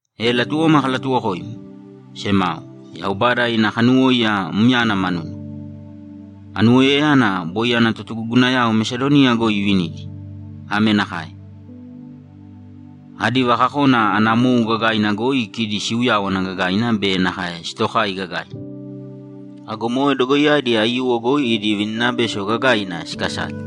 E latuwoma kalatuwokoimi, semao, Yaubada ina kanuwóiya myana manuna. Anuwoiyayana boi ana totugugunayao Mesadoniya goi ivinidi. Ame nakae: Adi vakakona ana mou gagaina goi kidi siuyáwana gagaina be nakae sitokai gagaina. Ago moe dogoiyadi aiyuwo goi idi vininabeso gagaiina sikasale.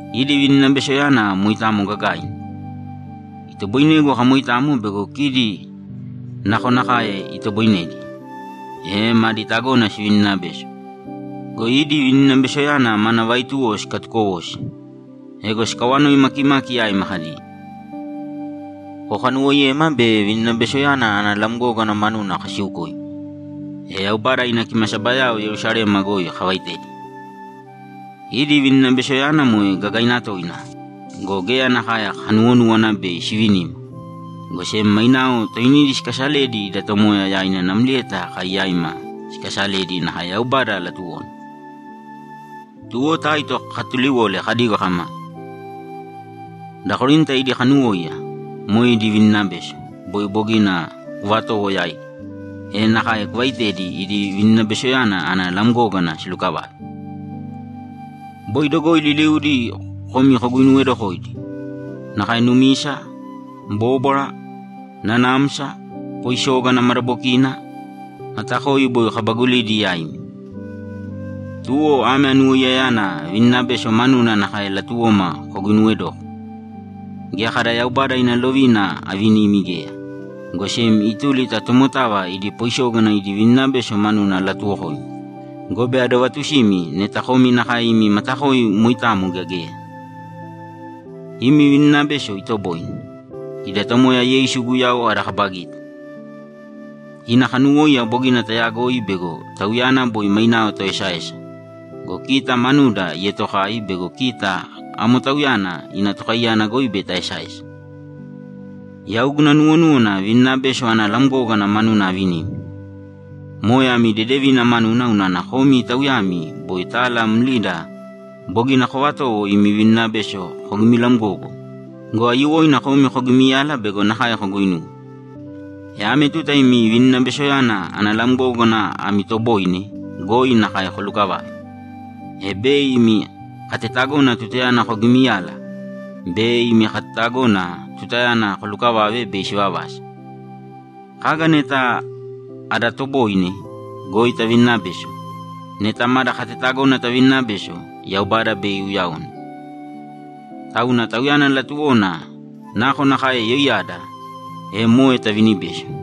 Idi vininabesoyana moitamo gagaina. Itoboinegu akamoitamo bego kidi nakonakae itoboinedi, e madi tagona sivininabeso go, idi vininabesoyana mana vaituwo sikatukowosi. Ego sikawanoi makimaki yaima kadi, ‘Kokanuwoiyema be vininabesoyana ana lamgógana manuna kasiukoimi, e Yaubada ina kimasabayao Yerusalema goi kavaitedi.’ Idi vininabesoyana moe gagaina toina go, geya nakae kanuwonúwana bei sivinima, go sem mainao toinidi sikasaledi ida Tomoya yaina namlieta kai yaima sikasaledi nakae Yaubada latuwona. Tuwo Taito kakatuliwole kadigo kama, ‘Da Korinta idi kanuwóiya, moe idi vininabeso, boi bogina kuvatowo yaidi, e nakae kuvaitēdi idi vininabesoyana ana lamgógana silukavave.’ Boi dogoi liliudi komi koguinuwedokoidi. Nakae numisa, bóbwara, nanamsa, poisógana madabokina, matakoi boi kabagulidi yaimi. Tuwo ame anuwoiyayana vininabeso manuna nakae latuwoma koguinuwedōko. Geya kada Yaubada ina lovina avinimi geya, go sem ituli ta tomotava idi poisógana idi vininabeso manudi alatuwokoimi gobe adovatusimi neta komi nakae imi matakoi moitamo gea geya. Imi vininabeso itoboine. Ida Tomoya Yeisu Guyau ada kaba gita. Ina kanuwóiya bogina tayagoi bego Tauyana boi mainao toesaesa go, kita manuda ietokai bego kita amo Tauyana ina tokaiyana goi bei taesaesa. Yau guna nuwonúwana vininabeso ana lamgógana manuna avinimi. Moe ami dedevina manuna unana komi tauyami boi tala mlida bogina kovatowo imi vininabeso kogimilamgogo go, aiyuwoina komi kogimiyala bego nakae koguinuwe. E ame tuta imi vininabesoyana ana lamgógana ami toboine goi nakae kolukavāve, e bei imi katetagona tutayana kogimiyala be imi katetagona tutayana kolukavave bei sivavasa. Kaga neta ada toboine goi tavininabeso, neta mada katetagona tavininabeso, Yaubada bei iuyaone. Tauna Tauyana latuwona nakonakae yoiyada, e moe tavinibeso.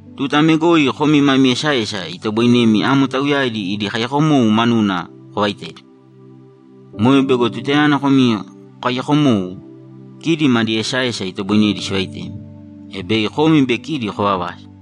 Tuta ame goi komi mami esaesa itoboinemi amo tauyadi idi kaiyakomou manuna kovaitedi. Moe bego tutayana komi kokaiyako mou, kidi madi esaesa itoboinedi sivaitemi, e bei komi be kidi kovavasa.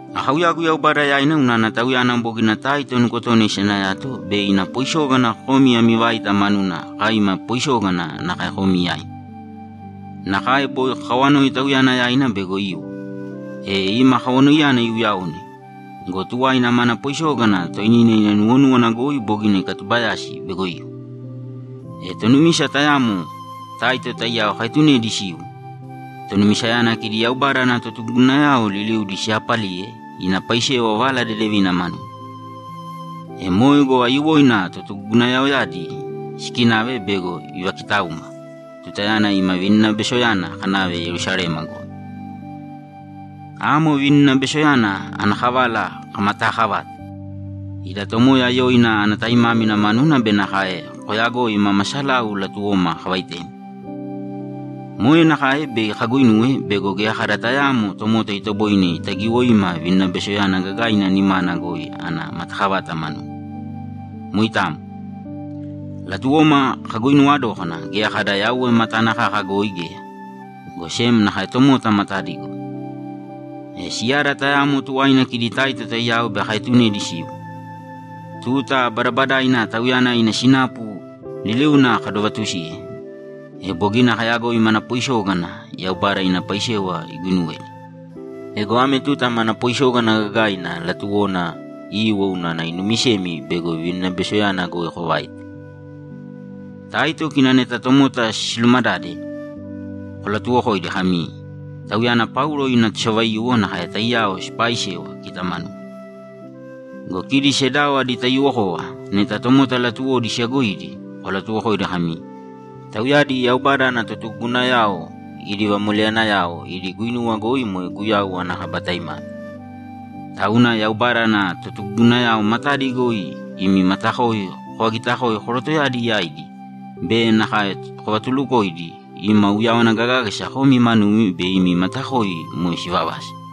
Akauyagu Yaubada yaina unana Tauyana bogina Taito nukotona isanayato bei ina poisógana komi ami vaita manuna kai ima poisógana nakae komi yaimi. Nakae boi kakawanoi tauyana yaina bego iwo, e ima kawanoiyana iuyaone go, tuwaina mana poisógana toinina ina nuwonúwana goi bogina ikatubayasi bego iwo. E tonumisa tayamo Taito taiyao kaetunedi siwo. Tonumisayana kidi Yaubada ana totugugunayao liliudi siyaapaliye ina paisewa Vala Dedevina manuna. E moe go, aiyuwoina totugugunayaoyadi sikinave bego ivakitauma tutayana imi vininabesoyana kanave Yerusalema goi. Amo vininabesoyana ana kavala kamataakavate ida Tomoya yoina ana taimámina manuna be nakae koyagoi mama salau latuwoma kavaitemi. Moe nakae bei kaguinuwe bego geya kada tayaamo tomota itoboine itagiwoima vininabesoyana gagaina nimana goi ana matakavata manuna. Moitamo. Latuwoma kaguinuwa dókana geya kada Yauwe matana kaka goi geya, go sem nakae tomota matadi goi. E siyada tayamo tuwaina kidi Taito taiyao bei kaetunedi siwo. Tuta badabadaina tauyana ina sinapu liliuna kadovatusiye, e bogina kayagoi mana poisógana Yaubada ina paisewa iguinuwedi. Ego ame tuta mana poisógana gagaina latuwona iwo unana inumisemi bego vininabesoyana goi kovaita. Taito kina neta tomota silumadade, kolatuwokoidi kami, ‘Tauyana Paulo ina tosavaiyuwo nakae taiyao sipaaisewa kita manuda.’ Go kidi sedao adi taiyuwokova neta tomota latuwodi siyagoidi, kolatuwokoidi kami, ‘Tauyadi Yaubada ana totugugunayao idi vamoleyanayao idi guinuwa goi moe Guyau ana kaba taimámina.’ Tauna Yaubada ana totugugunayao matadi goi imi matakoi kovagitakōe korotoyadi yaidi be nakae kovatulukōidi ima uyawana gagágasa komi manumi be imi matakoi moe sivavasa.